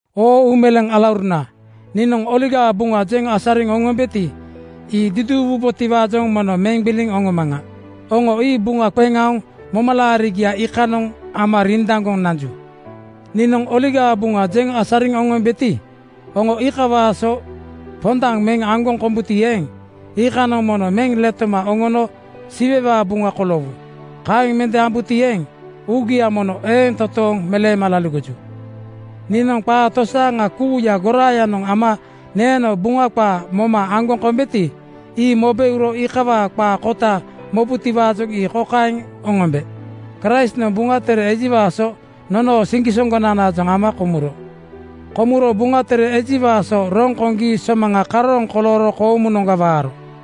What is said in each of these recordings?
Oo uumeleeŋ alauruna, niinoŋ Oligaa Buŋa jeŋ asariŋ oŋombeti, ii duduuwubotiwaajoŋ mono meŋ gbiliŋ oŋomaŋa. Oŋo ii buŋa qeŋ aoŋ momalaarigia iikanoŋ ama rindaŋgoŋ nanju. Niinoŋ Oligaa Buŋa jeŋ asariŋ oŋombeti, oŋo ii iikawaa so pondaŋ meŋ aŋgoŋ kombuti eeŋ, iikanoŋ mono meŋ letoma oŋono Siwewaa buŋa koloowu. Kaeŋ mende ambuti eeŋ, uugia mono eeŋ totooŋ meleema laligoju. Niinoŋ qaa tosaaŋa kuuya goraayanoŋ ama neeno Buŋa qaa moma aŋgoŋ kombeti, ii mobe uro iikawaa qaa kota mobutiwaajoŋ ii kokaeŋ oŋombe: Kraistnoŋ Buŋa Tere ejiwaa so nonoo siŋgisoŋgonanaajoŋ ama komuro. Komuro Buŋa Tere ejiwaa so roŋ koŋgi somaŋa karooŋ kolooro koomunoŋga waaro.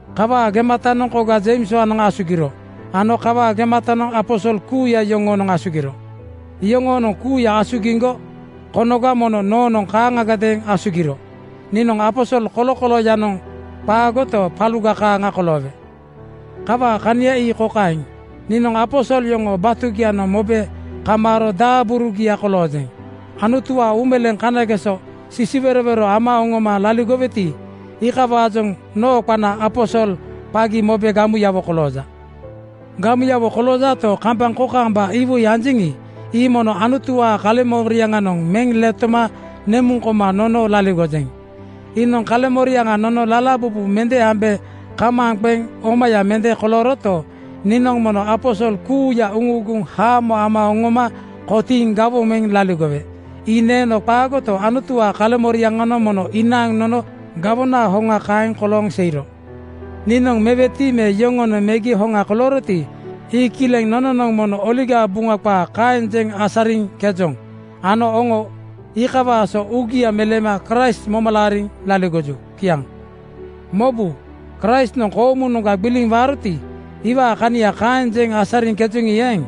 Kawaa gematanoŋ koga Jeimswaanoŋ asugiro ano kawaa gematanoŋ aposol kuuya yoŋoonoŋ asugiro. Yoŋoonoŋ kuuya asugiŋgo konoga mono noonoŋ kaaŋagadeeŋ asugiro. Niinoŋ aposol kolokolooyanoŋ qaagoto, paluga kaaŋa koloowe. Kawaa kania ii kokaeŋ: Niinoŋ aposol yoŋoo batugianoŋ mobe kamaaro daaburugiaga koloojeŋ. Anutuwaa uumeleeŋ kanageso sisiwerowero ama oŋoma laligoweti, iikawaajoŋ noo qana aposol qagi mobe gamuyawo kolooja. Gamuyawo koloojato, kambaŋ kokaamba iwoi anjeŋi, ii mono Anutuwaa kaleŋmoriaŋanoŋ meŋ letoma nemuŋ koma nono laligojeŋ. Iinoŋ kaleŋmoriaŋa nono lalabubu mende ambe kamaaŋ qeŋ omaya mende kolooroto, niinoŋ mono aposol kuuya uŋuuguŋ haamo ama oŋoma kotiiŋ gawoŋ meŋ laligowe. Ii neeno qaagoto, Anutuwaa kaleŋmoriaŋanoŋ mono inaaŋ nono gawonaa hoŋa kaeŋ kolooŋ seiro. Niinoŋ meweti me yoŋonoŋ megi hoŋa kolooroti, ii kileŋ. Nononoŋ mono Oligaa Buŋa qaa kaeŋ jeŋ asariŋkejoŋ ano oŋo iikawaa so uugia meleema Kraist moma laariŋ laligoju. Kiaŋ. Mobu! Kraistnoŋ koomunoŋga gbiliŋ waaroti, iwaa kania kaeŋ jeŋ asariŋkejoŋi eeŋ,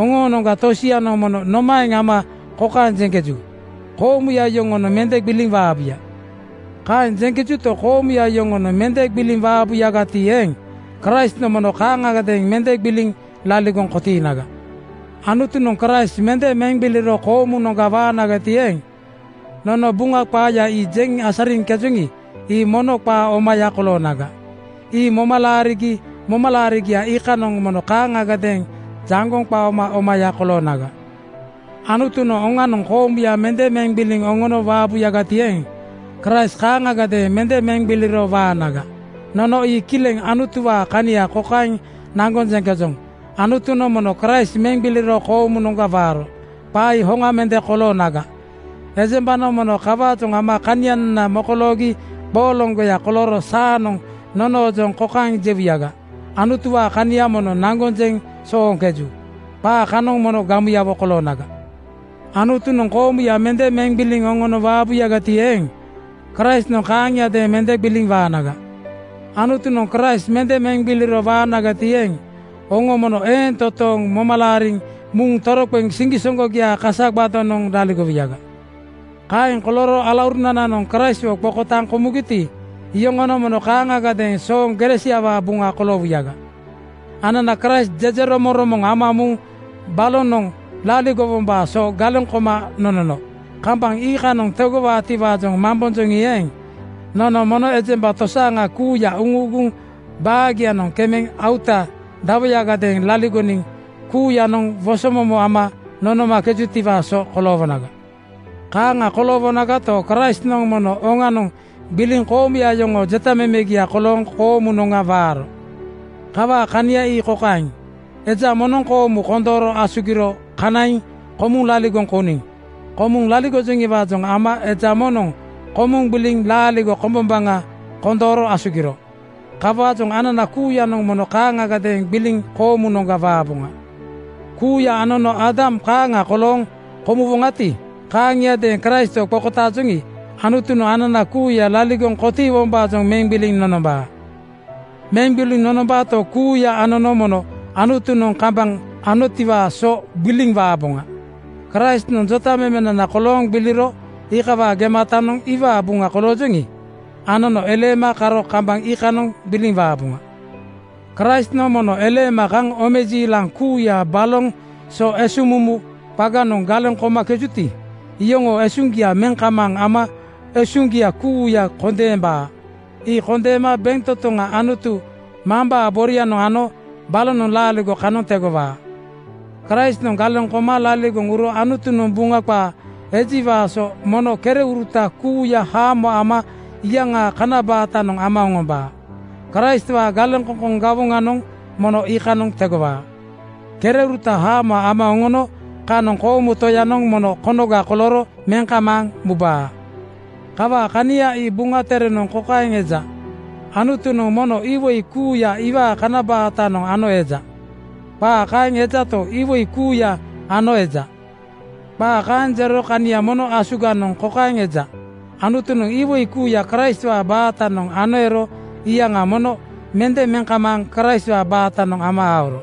oŋoonoŋga tosianoŋ mono nomaeŋ ama kokaeŋ jeŋkeju, “Koomuya yoŋonoŋ mende gbiliŋ waabuya.” Kaeŋ jeŋkejuto, koomuya yoŋonoŋ mende gbiliŋ waabuyagati eeŋ, Kraistnoŋ mono kaaŋagadeeŋ mende gbiliŋ laligoŋ kotiinaga. Anutunoŋ Kraist mende meŋ gbiliro koomunoŋga waanagati eeŋ, nono Buŋa qaaya ii jeŋ asariŋkejoŋi ii mono qaa omaya koloonaga. Ii moma laarigi momalaarigia iikanoŋ mono kaaŋagadeeŋ jaŋgoŋ qaoma omaya koloonaga. Anutunoŋ oŋanoŋ koomuya mende meŋ gbiliŋ oŋono waabuyagati eeŋ, Kraist kaaŋagadeeŋ mende meŋ gbiliro waanaga. Nono ii kileŋ Anutuwaa kania kokaeŋ naŋgoŋ jeŋkejoŋ, “Anutunoŋ mono Kraist meŋ gbiliro koomunoŋga waaro.” Qaa ii hoŋa mende koloonaga, ejembanoŋ mono kawaajoŋ ama kanianana mokoloogi qooloŋgoya kolooro saanoŋ nonoojoŋ kokaeŋ jewuyaga, “Anutuwaa kania mono naŋgoŋ jeŋ sooŋkeju.” Qaa kanoŋ mono gamuyawo koloonaga. Anutunoŋ koomuya mende meŋ gbiliŋ oŋono waabuti eeŋ, Kraistnoŋ kaaŋiadeeŋ mende gbiliŋ waanaga. Anutunoŋ Kraist mende meŋ gbiliro waanagati eeŋ, oŋo mono eeŋ toontooŋ moma laariŋ muŋ toroqeŋ siŋgisoŋgogiaa kasagbadonoŋ laligowuyaga. Kaeŋ kolooro alaurunananoŋ Kraistwo qokotaaŋ komugiti, iyoŋonoŋ mono kaaŋagadeeŋ sooŋ gere siawaa buŋa koloowuyaga. Anana Kraist jejeromoŋromoŋ ama muŋ balonoŋ laligowombaa so galeŋ koma nonono kambaŋ iikanoŋ tegowaatiwaajoŋ mambonjoŋi eeŋ, nono mono ejemba tosaaŋa kuuya uŋuuguŋ baagianoŋ kemeŋ auta dawoyagadeeŋ laligoniŋ kuuyanoŋ woso momo ama nonomakejutiwaa so koloowonaga. Kaaŋa koloowonagato, Kraistnoŋ mono oŋanoŋ gbiliŋ koomuya yoŋoo jetamemegia kolooŋ koomunoŋga waaro. Kawaa kania ii kokaeŋ: Eja moŋnoŋ koomu kondooro asugiro kanaiŋ komuŋ laligoŋ kouniŋ. Komuŋ laligojoŋiwaajoŋ ama eja moŋnoŋ komuŋ gbiliŋ laaligo kombombaŋa kondooro asugiro. Kawaajoŋ anana kuuyanoŋ mono kaaŋagadeeŋ gbiliŋ koomunoŋga waaboŋa. Kuuya anono Aadam kaaŋa kolooŋ komuwoŋati, kaaŋiadeeŋ Kraistwo qokotaajoŋi, Anutunoŋ anana kuuya laligoŋ kotiiwombaajoŋ meŋ gbiliŋ nonombaa. Meŋ gbiliŋ nonombaato, kuuya anono mono Anutunoŋ kambaŋ anotiwaa so gbiliŋ waaboŋa. Kraistnoŋ jotamemenana kolooŋ gbiliro iikawaa gematanoŋ iwaa buŋa koloojoŋi, anono eleema karo kambaŋ iikanoŋ gbiliŋ waaboŋa. Kraistnoŋ mono eleema kaŋ omejiilaŋ kuuya baloŋ so esuŋmumu qaganoŋ galeŋ komakejuti, iyoŋoo usuŋgia meŋ kamaaŋ ama esuŋgia kuuya kondeembaa. Ii kondeema bentotoŋa Anutu Mambaa borianoŋ ano balonoŋ laaligo kanoŋ tegowaa. Kraistnoŋ galeŋ koma laligoŋ uro Anutunoŋ Buŋa qaa ejiwaa so “mono kereuruta kuuya haamo ama iyaŋaa kana baatanoŋ ama oŋombaa.” Kraistwaa galeŋkoŋkoŋ gawoŋanoŋ mono iikanoŋ tegowaa. Kereuruta haamo ama oŋono kanoŋ koomu Toyanoŋ mono konoga kolooro meŋ kamaaŋ mubaa. Kawaa kania ii Buŋa Terenoŋ kokaeŋ eja, “Anutunoŋ mono iwoi kuuya iwaa kana baatanoŋ ano eja.” Qaa kaeŋ ejato, “Iwoi kuuya ano eja,” qaa kaeŋ jero kania mono asuganoŋ kokaeŋ eja: Anutunoŋ iwoi kuuya Kraistwaa baatanoŋ ano ero iyaŋa mono mende meŋ kamaaŋ Kraistwaa baatanoŋ ama aoro.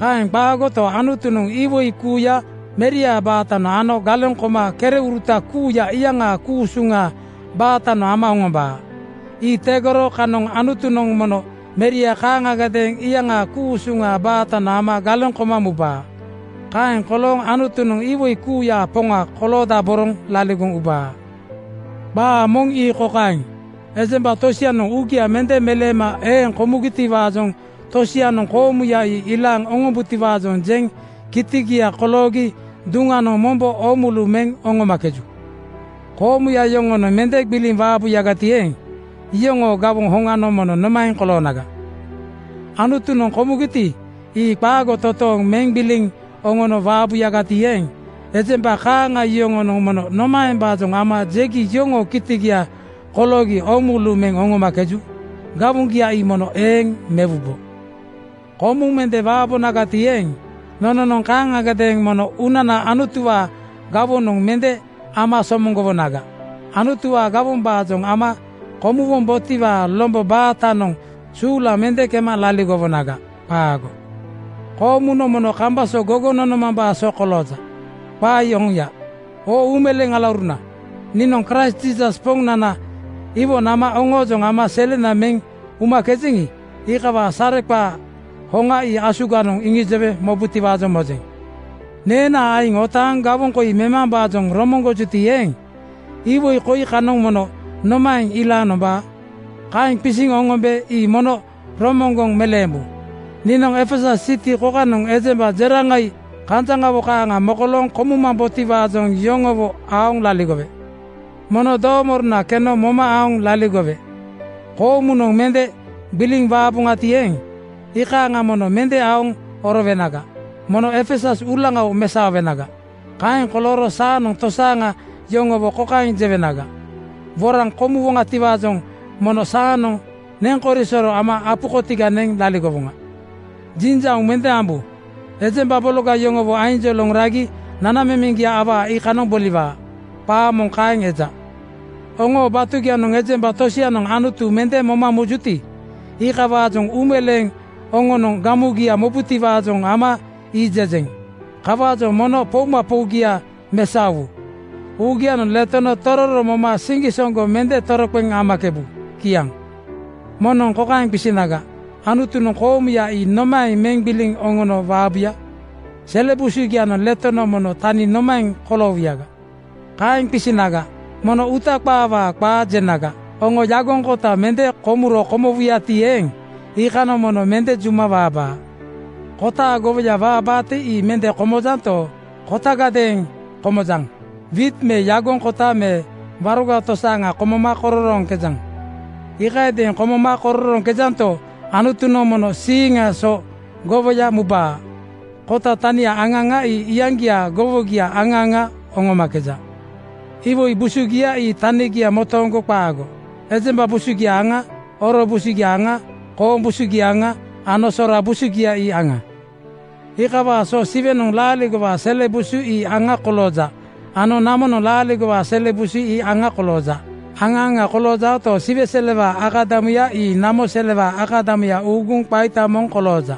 Kaeŋ qaagoto, Anutunoŋ iwoi kuuya Meriaa baatanoŋ ano galeŋ koma kereuruta kuuya iyaŋaa ku-usuŋaa baatanoŋ ama oŋombaa. Ii tegoro kanoŋ Anutunoŋ mono Meria kaaŋagadeeŋ iyaŋaa ku-usuŋaa baatanoŋ ama galeŋ koma mubaa. Kaeŋ kolooŋ Anutunoŋ iwoi kuuyaa Poŋa koloodaboroŋ laligoŋ ubaa. Qaa moŋ ii kokaeŋ: Ejemba tosianoŋ uugia mende meleema eeŋ komugitiwaajoŋ tosianoŋ koomuya ii ilaaŋ oŋombutiwaajoŋ jeŋ kitigia koloogi duŋanoŋ mombo oomulu meŋ oŋomakeju. Koomuya yoŋonoŋ mende gbiliŋ waabuyagati eeŋ, iyoŋoo gawoŋ hoŋanoŋ mono nomaeŋ koloonaga? Anutunoŋ komugiti, ii qaago totooŋ meŋ gbiliŋ oŋono waabuyagati eeŋ, ejemba kaaŋa yoŋonoŋ mono nomaembaajoŋ ama jegi yoŋoo kitigia koloogi oomulu meŋ oŋomakeju? Gawoŋgia ii mono eeŋ mewubo. Komuŋ mende waabonagati eeŋ, nononoŋ kaaŋagadeeŋ mono uunana Anutuwaa gawonoŋ mende ama somoŋgowonaga. Anutuwaa gawombaajoŋ ama komuwombotiwaa lombo baatanoŋ suulaŋ mende kema laligowonaga. Qaago. Koomunoŋ mono kambaŋ so gogoŋ nomambaa so kolooja. Qaa ii oŋia. Oo uumeleeŋ alauruna, niinoŋ Kraist Jiisas Poŋnana iwo nama oŋoojoŋ ama selena meŋ umakejeŋi, iikawaa sareqaa hoŋa ii asuganoŋ iŋijowe mobutiwaajoŋ mojeŋ. Neenaa aiŋ otaaŋ gawoŋ koi memambaajoŋ romoŋgojuti eeŋ, iwoi koi kanoŋ mono nomaeŋ ilaaŋ nombaa? Kaeŋ qisiŋ oŋombe ii mono romoŋgoŋ meleembu: Niinoŋ Efesus siti kokanoŋ ejemba jeraŋai kanjaŋawo kaaŋa mokolooŋ komumambotiwaajoŋ yoŋowo aoŋ laligowe. Mono doomorona keno moma aoŋ laligowe. Komuŋgo mende gbiliŋ waaboŋati eeŋ, iikaaŋa mono mende aoŋ orowenaga. Mono Efesus uulaŋawo mesaowenaga. Kaeŋ kolooro saanoŋ tosaaŋa yoŋowo kokaeŋ jewenaga, “Woraŋ komuwoŋatiwaajoŋ mono saanoŋ neŋkorisoro ama apu kotiga neŋ laligowoŋa.” Jinjauŋ mende ambu. “Ejemba bologa yoŋowo ainjoloŋ ragi nanamemeŋgia awaa iikanoŋ boliwaa.” Qaa moŋ kaeŋ eja. Oŋoo batugianoŋ ejemba tosianoŋ Anutu mende moma mujuti, iikawaajoŋ uumeleeŋ oŋonoŋ gamugia mobutiwaajoŋ ama ii jejeŋ. Kawaajoŋ mono poumapougia mesaowu. Uugianoŋ letono tororo moma siŋgisoŋgo mende toroqeŋ amakebu. Kiaŋ. Moŋnoŋ kokaeŋ qisinaga, “Anutunoŋ koomuya ii nomaeŋ meŋ gbiliŋ oŋono waabuya? Sele busugianoŋ letono mono tani nomaeŋ koloowuyaga?” Kaeŋ qisinaga, mono uuta qaawaa qaa jenaga. Oŋo yagoŋ kota mende komuro komowuyati eeŋ, iikanoŋ mono mende juma waabaa. Kotaa gowoya waabaati ii mende komojanto, kotagadeeŋ komojaŋ. Wiit me yagoŋ kota me waroga tosaaŋa komoma kororooŋkejaŋ. Iikayadeeŋ komoma kororooŋkejanto, Anutunoŋ mono siiŋaa so gowoya mubaa. Kota tania aŋa aŋa ii iyaŋgiaa gowogia aŋa aŋa oŋomakeja. Iwoi busugia ii tanigia motooŋgo qaago. Ejemba busugia aŋa, oro busugia aŋa, kooŋ busugia aŋa ano sora busugia ii aŋa. Iikawaa so Siwenoŋ laaligowaa sele busu ii aŋa kolooja ano namonoŋ laaligowaa sele busu ii aŋa kolooja. Aŋa aŋa koloojaoto, Siwe selewaa akadamuya ii namo selewaa akadamuya uuguŋ qaita moŋ kolooja.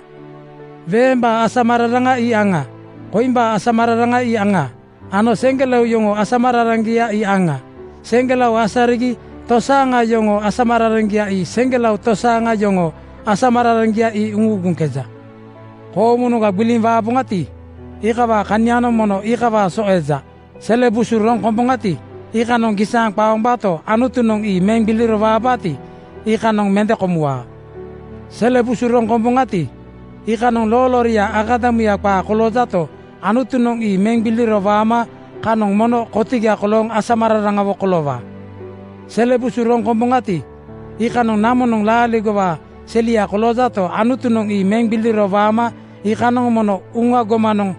Weembaa asamararaŋa ii aŋa, koimbaa asamararaŋa aŋa ano seŋgelao yoŋoo asamararaŋgia ii aŋa. Seŋgelao asarigi tosaaŋa yoŋoo asamararaŋgia ii seŋgelao tosaaŋa yoŋoo asamararaŋgia ii uuguŋkeja. Koomunoŋga gbiliŋ waaboŋati, iikawaa kanianoŋ mono iikawaa so eja. Sele busu roŋ komboŋati, iikanoŋ gisaaŋ qaombaato, Anutunoŋ ii meŋ gbiliro waabaati, iikanoŋ mende komuwaa. Sele busu roŋ komboŋati, iikanoŋ loolooria akadamuya qaa koloojato, Anutunoŋ ii meŋ gbiliro waama kanoŋ mono kotiga kolooŋ asamararaŋawo koloowaa. Sele busu roŋ komboŋati, iikanoŋ namonoŋ laaligowaa selia koloojato, Anutunoŋ ii meŋ gbiliro waama iikanoŋ mono uŋa gomanoŋ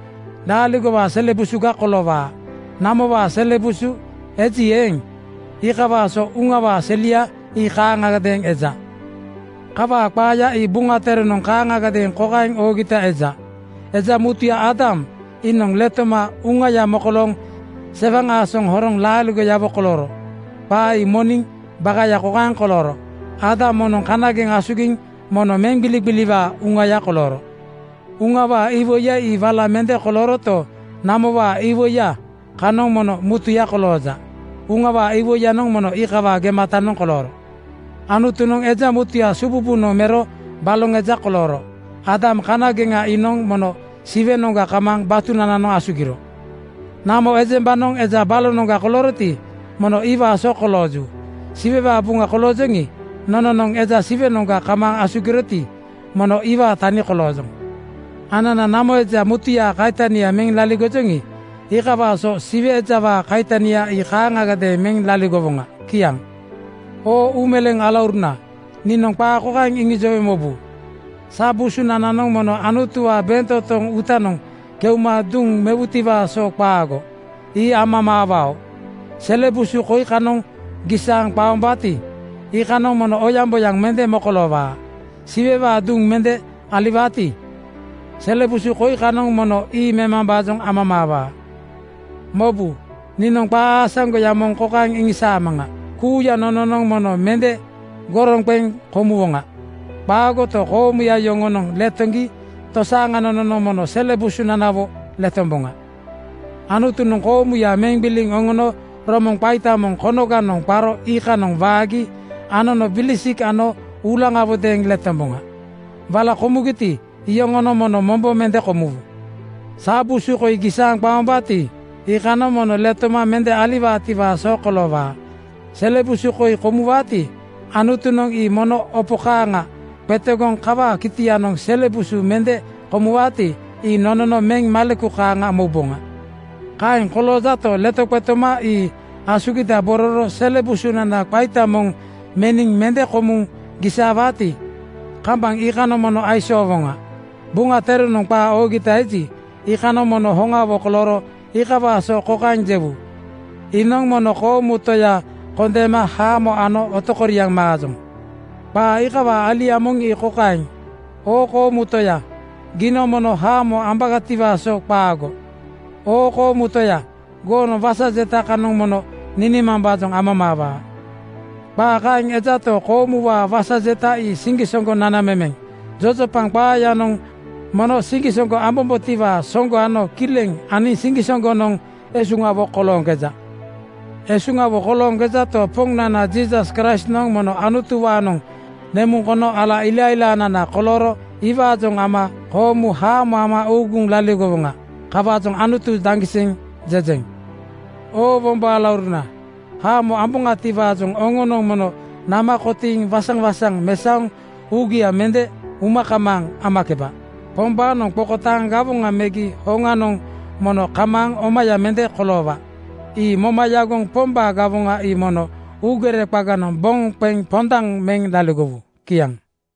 laaligowaa sele busuga koloowaa. Namowaa sele busu eji eeŋ, iikawaa so uŋawaa selia ii kaaŋagadeeŋ eja. Kawaa qaaya ii Buŋa Terenoŋ kaaŋagadeeŋ kokaeŋ oogita eja, “Eja mutuya Aadam iinoŋ letoma uŋaya mokolooŋ sewaŋ aasoŋ horoŋ laaligoyawo kolooro.” Qaa ii moniŋ bakaya kokaeŋ kolooro: Aadam moŋ kanageŋ asugiŋ mono meŋgbiligbiliwaa uŋaya kolooro. Uŋawaa iwoiya ii wala mende kolooroto, namowaa iwoiya kanoŋ mono mutuya kolooja. Uŋawaa iwoiyanoŋ mono iikawaa gematanoŋ kolooro. Anutunoŋ eja mutuya sububunoŋga mero baloŋ eja kolooro. Aadam kanageŋa iinoŋ mono Siwenoŋga kamaaŋ batunananoŋ asugiro. Namo ejembanoŋ eja balonoŋga kolooroti, mono iwaa so kolooju. Siwewaa buŋa koloojoŋi, nononoŋ eja Siwenoŋga kamaaŋ asugiroti, mono iwaa tani koloojoŋ. Anana namo eja mutuyaa kaitania meŋ laligojoŋi, iikawaa so Siwe ejawaa kaitania ii kaaŋagadeeŋ meŋ laligowoŋa. Kiaŋ. Oo uumeleeŋ alauruna, niinoŋ qaa kokaeŋ iŋijowe mobu: Sa busunananoŋ mono Anutuwaa bentotoŋ uutanoŋ keuma duŋ mewutiwaa so qaago. Ii amamaawao. Sele busu koi kanoŋ gisaaŋ qaombaati, iikanoŋ mono oyaŋboyaŋ mende mokoloowaa. Siwewaa duŋ mende aliwaati, sele busu koi kanoŋ mono ii memambaajoŋ amamaawaa. Mobu! Niinoŋ qaa aasaŋgoya moŋ kokaeŋ iŋisaamaŋa: Kuuya nononoŋ mono mende goroŋ qeŋ komuwoŋa. Qaagoto, koomuya yoŋonoŋ letoŋgi tosaaŋa nononoŋ mono sele busunanawo letomboŋa. Anutunoŋ koomuya meŋ gbiliŋ oŋono romoŋ qaita moŋ konoganoŋ qaro iikanoŋ waagi anono bilisik ano uulaŋawodeeŋ letomboŋa. Wala komugiti, iyoŋonoŋ mono mombo mende komuwu. Sa busu koi gisaaŋ qaombaati, iikanoŋ mono letoma mende aliwaatiwaa so koloowaa. Sele busu koi komuwaati, Anutunoŋ ii mono opo kaaŋa qetegoŋ kawaa kitianoŋ sele busu mende komuwaati, ii nonono meŋ maleku kaaŋa mouboŋa. Kaeŋ koloojato, letoqetoma ii asugidabororo sele busunana qaita moŋ meniŋ mende komuŋ gisaawaati, kambaŋ iikanoŋ mono aisoowoŋa. Buŋa Terenoŋ qaa oogita eji, iikanoŋ mono hoŋawo kolooro iikawaa so kokaeŋ jewu, “Iinoŋ mono koomu Toya kondeema haamo ano otokoriaŋ maajoŋ.” Qaa iikawaa alia moŋ ii kokaeŋ, “Oo koomu Toya, giinoŋ mono haamo ambagatiwaa so qaago. Oo koomu Toya, goonoŋ wasa jeta kanoŋ mono ninimambaajoŋ amamaawaa.” Qaa kaeŋ ejato, koomuwaa wasa jeta ii siŋgisoŋgo nanamemeŋ. Jojopaŋ qaayanoŋ mono siŋgisoŋgo ambombotiwaa soŋgo ano kileŋ aniŋ siŋgisoŋgonoŋ esuŋawo kolooŋkeja. Esuŋawo kolooŋkejato, Poŋnana Jiisas Kraistnoŋ mono Anutuwaanoŋ nemuŋ kono ala ilailaanana kolooro iwaajoŋ ama koomu haamo ama uuguŋ laligowoŋa. Kawaajoŋ “Anutu daŋgiseŋ!” jejeŋ. Oo wombo alauruna, haamo amboŋatiwaajoŋ oŋonoŋ mono nama kotiiŋ waŋsaŋ-waŋsaŋ mesaoŋ uugia mende uma kamaaŋ amakeba. Pombaanoŋ qokotaaŋ gawoŋa megi hoŋanoŋ mono kamaaŋ omaya mende koloowaa. Ii moma yagoŋ Pombaa gawoŋa ii mono uugere qaganoŋ boŋ qeŋ pondaŋ meŋ laligowu. Kiaŋ.